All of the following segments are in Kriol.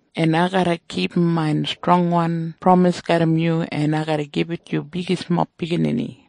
En ai garra kipum main strongwan pramis garram yu, en ai garra gibit yu bigismob biginini.”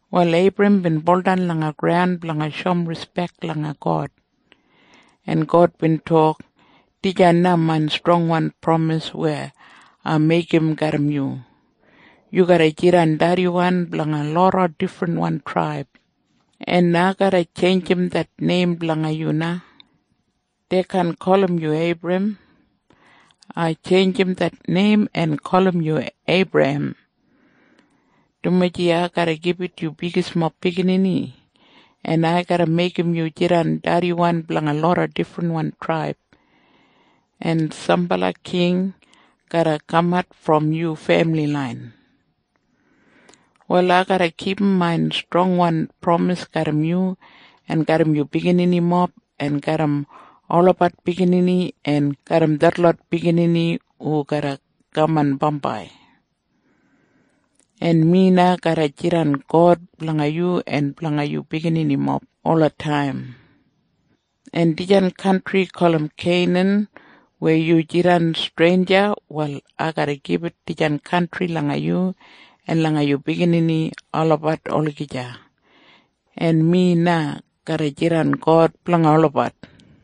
Wal Eibram bin baudan langa graun blanga shoum rispek langa God, en God bin tok, “Dijan na main strongwan pramis weya ai meigim garram yu. Yu garra jidan dediwan blanga loda difrinwan traib. En ai garra tjeinjim det neim blanga yu na. Dei kaan gulum yu Eibram. Ai tjeinjim det neim en gulum yu Eibrahem, dumaji ai garra gibit yu bigismob biginini, en ai garra meigim yu jidan dediwan blanga loda difrinwan traib, en sambala king garra kamat brom yu femili lain. “Wal ai garra kipum main strongwan pramis garram yu en garram yu bigininimob en garram olabat biginini en garram detlot biginini hu garra kaman bambai. En mi na garra jidan God blanga yu en blanga yu bigininimob ola taim. En dijan kantri gulum Keinan weya yu jidan streinja, wal ai garra gibit dijan kantri langa yu en langa yu biginini olabat olagija. En mi na garra jidan God blanga olabat.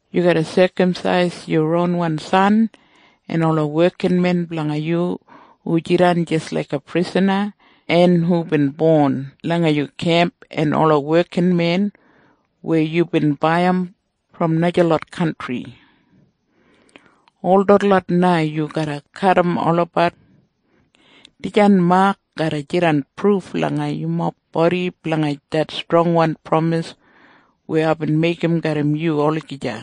Yu garra sekamsais yu ronwan san en ola wekinmen blanga yu hu jidan jis laiga prisana en hubin bon langa yu kemp en ola wekinmen weya yu bin baiyim brom najalot kantri. Ol detlot na yu garra kadim olabat. Dijan mak garra jidan pruf langa yumob bodi blanga det strongwan pramis weya aibin meigim garram yu olagija.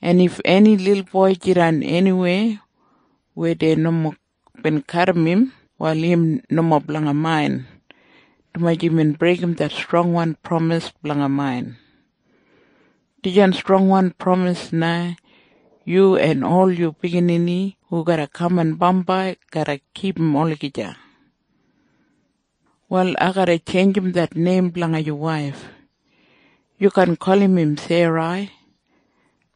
En if eni lilboi jidan eniwei weya dei nomo bin kadim im, wal im nomo blanga main, dumaji imbin breigim det strongwan pramis blanga main. Dijan strongwan pramis na yu en ol yu biginini hu garra kaman bambai garra kipum olagija. “Wal ai garra tjeinjim det neim blanga yu waif. Yu kaan gulum im Serai.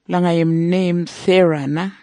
Blanga im neim Sera na,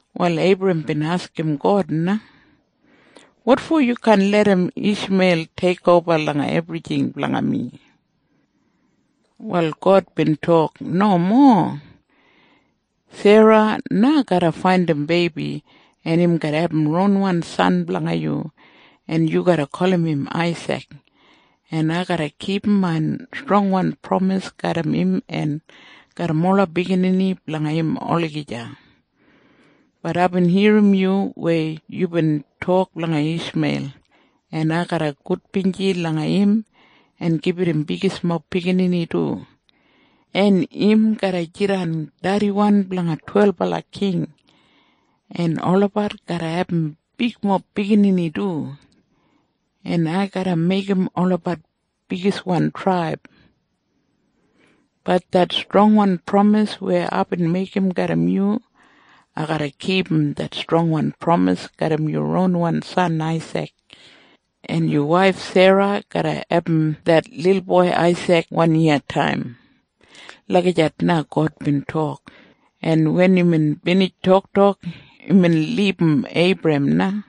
Wal Eibrahem bin askim God na, “Wotfo yu kaan larram Ishmeil teikoba ola ebrijing blanga mi?” Wal God bin tok, “Nomo. Sera na garra faindim beibi, en im garra abum ronwan san blanga yu, en yu garra gulum im neim Aisik. En ai garra kipum main strongwan pramis garram im en garram ola biginini blanga im olagija. Bat aibin irrim yu weya yubin tok blanga Ishmeil, en ai garra gudbinji langa im en gibit im bigismob biginini du, en im garra jidan dediwan blanga twelbala king, en olabat garra abum bigmob biginini du, en ai garra meigim olabat bigiswan traib. Bat det strongwan pramis weya aibin meigim garram yu, ai garra kipum det strongwan pramis garram yu ronwan san Aisik. En yu waif Sera garra abum det lilboi Aisik wanyiyataim.” Lagijat na God bin tok, en wen imbin binij toktok, imbin libum Eibrahem na.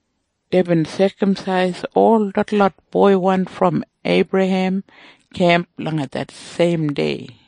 Deibin sekamsais ol detlot boiwan brom Eibrahem kemp langa det seim dei.